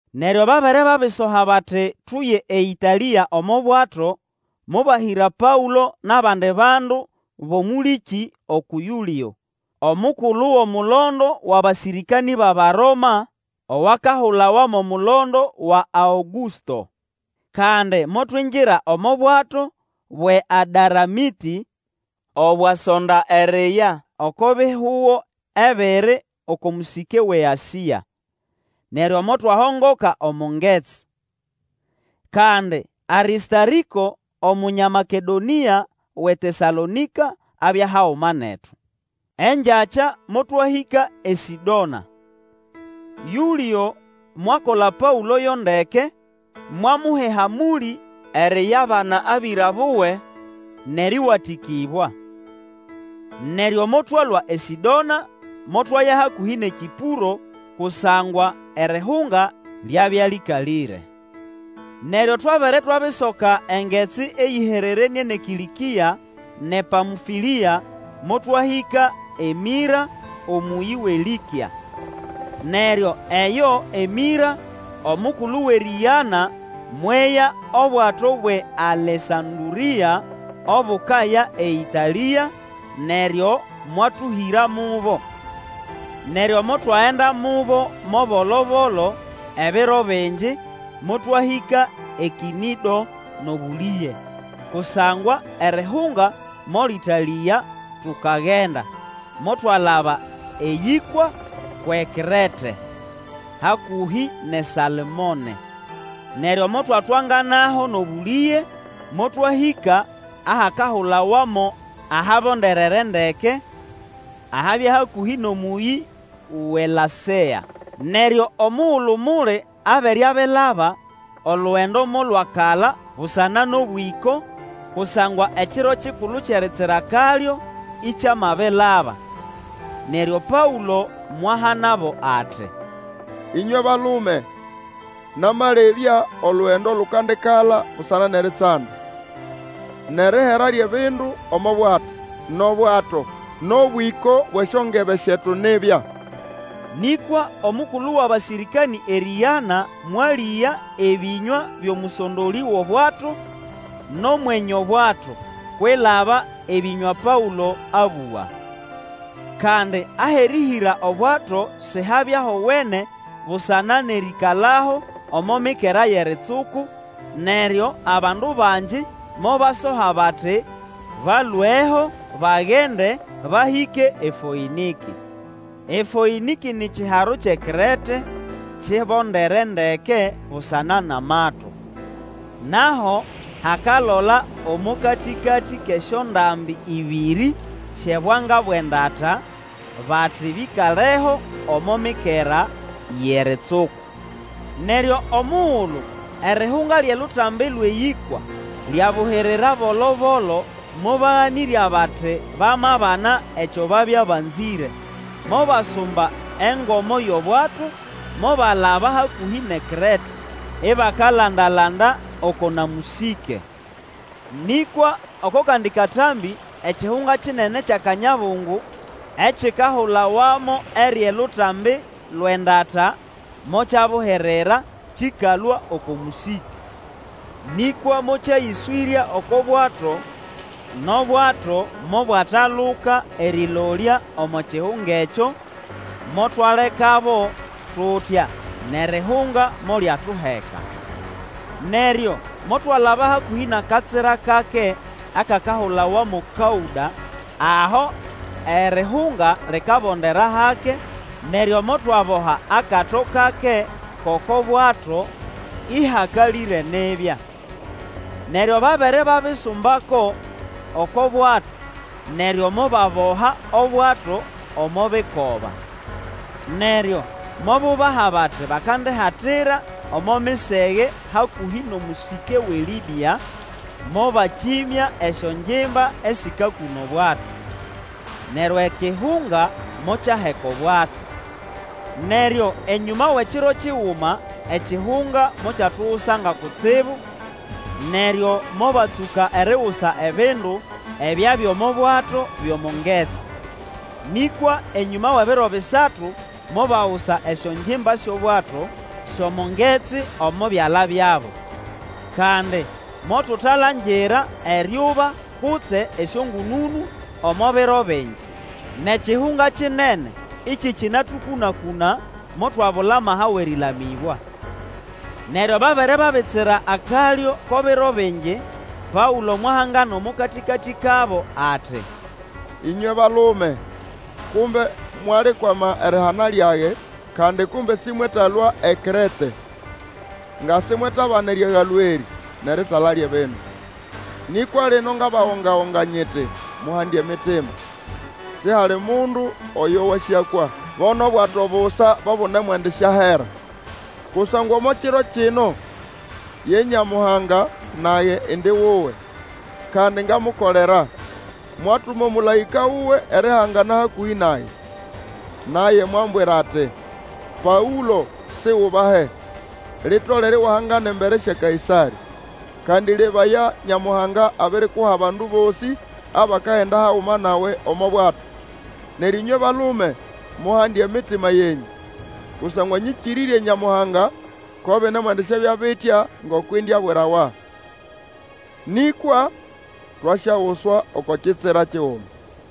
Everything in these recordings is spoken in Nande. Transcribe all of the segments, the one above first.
Neryo babere babisoha bati tuye eĨtalĩa omo bwato, mobahĩra Paũlo nʼabandi bandu bʼomũlĩkĩ uku Yũlĩo, omukulu wʼomulondo wʼabasĩrĩkanĩ bʼAbaroma owakahulawa mo Mulondo wa Aũgũsto. Kandi motwingira omo bwato bwʼeAdaramĩtĩ, obwasonda eriya oko bihugo ebiri oko mũsĩke wʼeAsĩa. Neryo motwahongoka omo ngetsi. Kandi Arĩstarĩko, Omunya Makedonĩa wʼeTesalonĩka, abya haguma netu. Engyakya motwahĩka eSĩdona. Yũlĩo mwakola Paũlo yo ndeke, mwamuha ehamũlĩ eriyabana abĩra buwe nʼerĩwatĩkĩbwa. Neryo motwalũa eSĩdona motwaya hakũhĩ nʼeKĩpũro kusangwa erihunga lyabya lĩkalĩre. Neryo twabere twabisoka engetsi eyĩhererenĩe nʼeKĩlĩkĩa nʼePamfũlĩa, motwahĩka eMĩra omũyĩ wʼeLĩkĩa: Neryo eyo eMĩra omukulu wʼerĩgana, mweya obwato bwʼeAlesandũrĩa obukaya eĨtalĩa, neryo mwatũhĩra mubo. Neryo motwagenda mubo mo bolobolo ebiro bingi, motwahĩka eKĩnĩdo nʼobũlĩge, kusangwa erihunga molĩtalĩga tukagenda, motwalaba eyĩkwa kwʼeKrete, hakũhĩ nʼeSalmone. Neryo motwatwanganaho nʼobũlĩge, motwahĩka ahakahulawa mo Ahabonderere Ndeke, ahabya hakũhĩ nʼomũyĩ wʼeLasea. Neryo omugulu muli abere abilaba, olugendo molwakala busana nʼobwĩko, kusangwa Ekiro kikulu Kyʼeritsira Kalyo ikyamabilaba. Neryo Paũlo mwahanabo ati, Ĩnywe balume! Namalebya olugendo lukandikala busana nʼeritsanda, nʼerihera lyʼebindu omo bwato, nʼobwato, nʼobwĩko bwʼesyongebe syetu nibya. Nĩkwa omukulu wʼabasĩrĩkanĩ erĩgana mwalĩga ebĩnywa byʼomũsondolĩ wʼobwato, nʼomwenye obwato, kwilaba ebĩnywa Paũlo abũga. Kandi ahʼerĩhĩra obwato sihabya howene busana nʼerĩkalaho omo mikera yʼeritsuku, neryo abandu bangi mobasoha bati balweho, bagende, bahĩke eFoĩnĩkĩ. EFoĩnĩkĩ ni kiharo kyʼeKrete kibondere ndeke busana nʼamato. Nʼaho hakalola omo katĩkatĩ kʼesyondambi ĩbĩrĩ syʼebwanga bwʼendata, bati bĩkaleho omo mikera yʼeritsuku. Neryo omugulu erihunga lyʼelutambi lwʼeyĩkwa lyabuhirira bolo-bolo, mobaganĩrya bati bamabana ekyo babya banzĩre, mobasumba engomo yʼobwato, mobalaba hakũhĩ nʼeKrete, ibakalandalanda oko na mũsĩke. Nĩkwa oko kandi katambĩ ekihunga kinene kyʼakanyabungu ekikahulawa mo Eryʼelutambi lwʼendata, mokyabuhirira kĩkalũa oko mũsĩke. Nĩkwa mokyayĩswĩrya oko bwato, nʼobwato mobwataluka erĩlolya omo kihunga ekyo, motwalekabo tutya, nʼerihunga molyatuheka. Neryo motwalaba hakũhĩ nʼakatsira kake akakahulawa mo Kaũda aho erihunga likabondera hake, neryo motwaboha akato kake kʼoko bwato, ĩhakalĩre nibya. Neryo babere babisumbako oko bwato, neryo mobaboha obwato omo bikoba. Neryo mobubaha bati bakandihatira omo misege hakũhĩ nʼomũsĩke wʼeLĩbĩa, mobakĩmya esyongimba esĩkakũna obwato. Neryo ekihunga mokyaheka obwato. Neryo enyũma wʼekiro kiguma ekihunga mokyatugusanga kutsibu, neryo mobatsũka erigusa ebindu ebyabya omo bwato byʼomo ngetsi. Nĩkwa enyũma wʼebiro bisatu mobagusa esyongimba syʼobwato syʼomo ngetsi omo byala byabo. Kandi motutalangira eryuba kutse esyongũnũnũ omo biro bingi, nʼekihunga kinene ĩkĩkĩnatũkũna-kũna, motwabula amaha wʼerĩlamĩbwa. Neryo babere babitsira akalyo ko biro bingi, Paũlo mwahangana omo katĩkatĩ kabo ati, Ĩnywe balume! Kumbe mwalikwama erihana lyage, kandi kumbe sĩmwetalũa eKrete, nga simwetabana eriagalwa erĩ, nʼeritala lyʼebindu. Nĩkwa lino ngabagonga-gonga nyiti muhande emitima! Sihali mundu oyo wasyakwa, bo nʼobwato busa bo bunemwendisyahera. Kusangwa omo kiro kino, ye Nyamuhanga, nage indi wuwe, kandi ngamukolera, mwatuma omũlaĩka wuwe erihangana hakũhĩ nage. Naye mwambwira ati, Paũlo, Sigubahe! Litolere iwahangana embere sya Kaĩsarĩ. Kandi lebaya, Nyamuhanga abirikuha abandu bosĩ abakagenda haguma nawe omo bwato. Neryo ĩnywe balume, muhande emitima yenyũ! Kusangwa nyĩkĩrĩrye Nyamuhanga, ko binemwendisyabya bitya ngoko indiabwirawa. Nĩkwa twasyaguswa oko kitsira kiguma.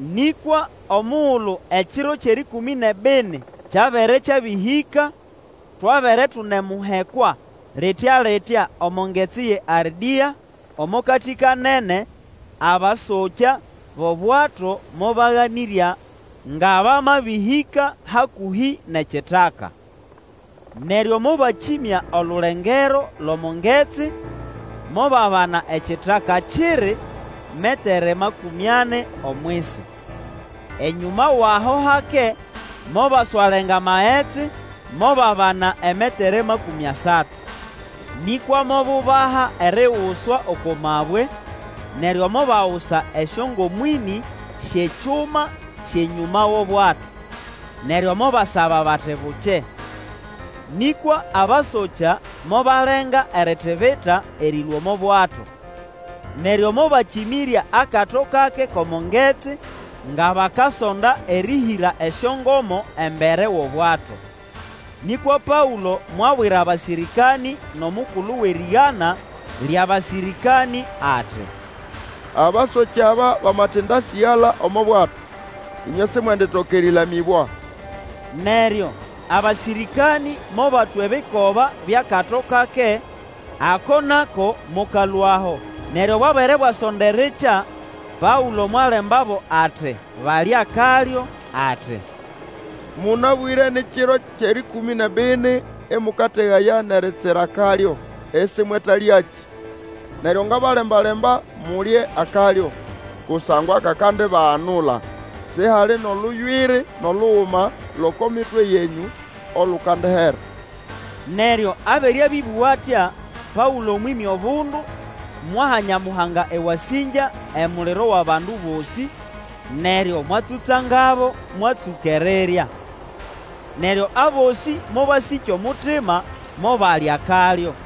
Nĩkwa omugulu ekiro kyʼerĩkũmĩ nʼebini kyabere kyabĩhĩka, twabere tunemuhekwa litya-litya omo ngetsi ye Ardĩa, omo katĩ-kanene, abasokya bʼobwato mobaganĩrya nga bamabĩhĩka hakũhĩ nʼekitaka. Neryo mobakĩmya olulengero lʼomo magetsi, mobabana ekitaka kiri metere makũmĩ ani omwisi. Enyũma wʼaho hake mobaswalenga magetsi, mobabana emetere makũmĩ asatu. Nĩkwa mobubaha eriguswa oko mabwe, neryo mobagusa esyongomo ĩnĩ syʼekyuma syʼenyũma wʼobwato, neryo mobasaba bati bukye. Nĩkwa abasokya mobalenga eritibita erĩlũa omo bwato. Neryo mobakĩmĩrya akato kake kʼomo ngetsi, nga bakasonda erĩhĩra esyongomo embere wʼobwato. Nĩkwa Paũlo mwabwira abasĩrĩkanĩ nʼomukulu wʼerĩgana lyʼabasĩrĩkanĩ ati, Abasokya aba bamatĩndasĩgala omo bwato, ĩnywe simwenditoka erĩlamĩbwa. Neryo abasĩrĩkanĩ mobatwa ebikoba byʼakato kake ako nako mokalũaho. Neryo bwabere bwasonda erikya, Paũlo mwalembabo ati balye akalyo, ati, Mũnabwĩre ni kiro kyʼerĩkũmĩ nʼebini ĩmũkategaya nʼeritsira akalyo, isimwetalyakĩ. Neryo ngabalemba-lemba mulye akalyo, kusangwa kakandibaganula. Sihali nʼoluywiri nʼoluguma lʼoko mitwe yenyũ olukandihera. Neryo abere abĩbũga atya, Paũlo mwĩmya obundu, mwaha Nyamuhanga ewasĩngya emuliro wʼabandu bosĩ, neryo mwatsũtsangabo, mwatsũka erirya. Neryo abosĩ mobasĩkya omutima, mobalya akalyo.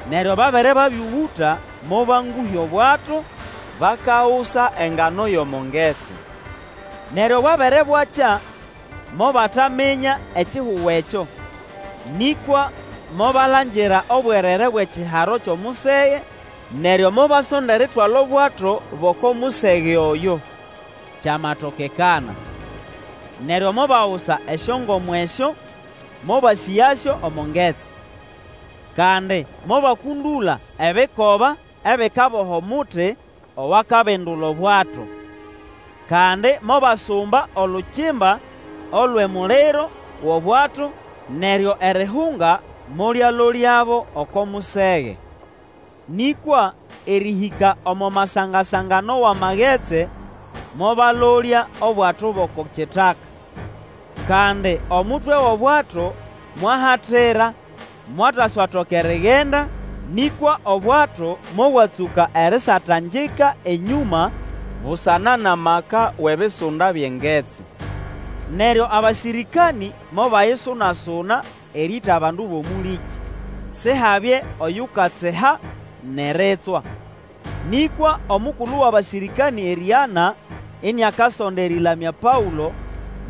Neryo babere babĩũgũta, mobangũhya obwato, bakagusa engano yʼomo ngetsi. Neryo bwabere bwakya, mobataminya ekihugo ekyo, nĩkwa mobalangira obwerere bwʼekiharo kyʼomusege, neryo mobasonda eritwala obwato bʼoko musege oyo, kyamatokekana. Neryo mobagusa esyongomo esyo, mobasĩgasyo omo ngetsi. Kandi mobakũndũla ebikoba ebikaboha omuti owakabindula obwato. Kandi mobasumba olukimba olwʼemuliro wʼobwato, neryo erihunga molyalolyabo oko musege. Nĩkwa erĩhĩka omo masanga-sangano wʼamagetsi, mobalolya obwato bʼoko kitaka. Kandi omutwe wʼobwato mwahatira, mwataswatoka erigenda, nĩkwa obwato mobwatsũka erisatangika enyũma busana nʼamaka wʼebisunda byʼengetsi. Neryo abasĩrĩkanĩ mobayisunasuna erĩĩta bandu bʼomũlĩkĩ, Sihabye oyukatsiha nʼeritswa. Nĩkwa omukulu wʼabasĩrĩkanĩ erĩgana, iniakasonda erĩlamya Paũlo,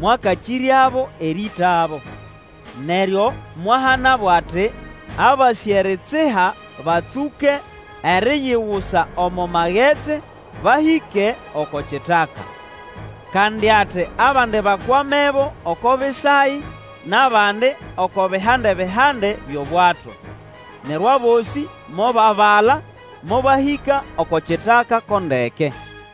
mwakakĩryabo erĩĩtabo, neryo mwahanabo ati abasĩ eritsiha batsũke eriyigusa omo magetsi, bahĩke oko kitaka. Kandi ati abandi bakwamebo oko bisayi, nʼabandi oko bihande-bihande byʼobwato. Neryo abosĩ mobabala, mobahĩka oko kitaka ko ndeke.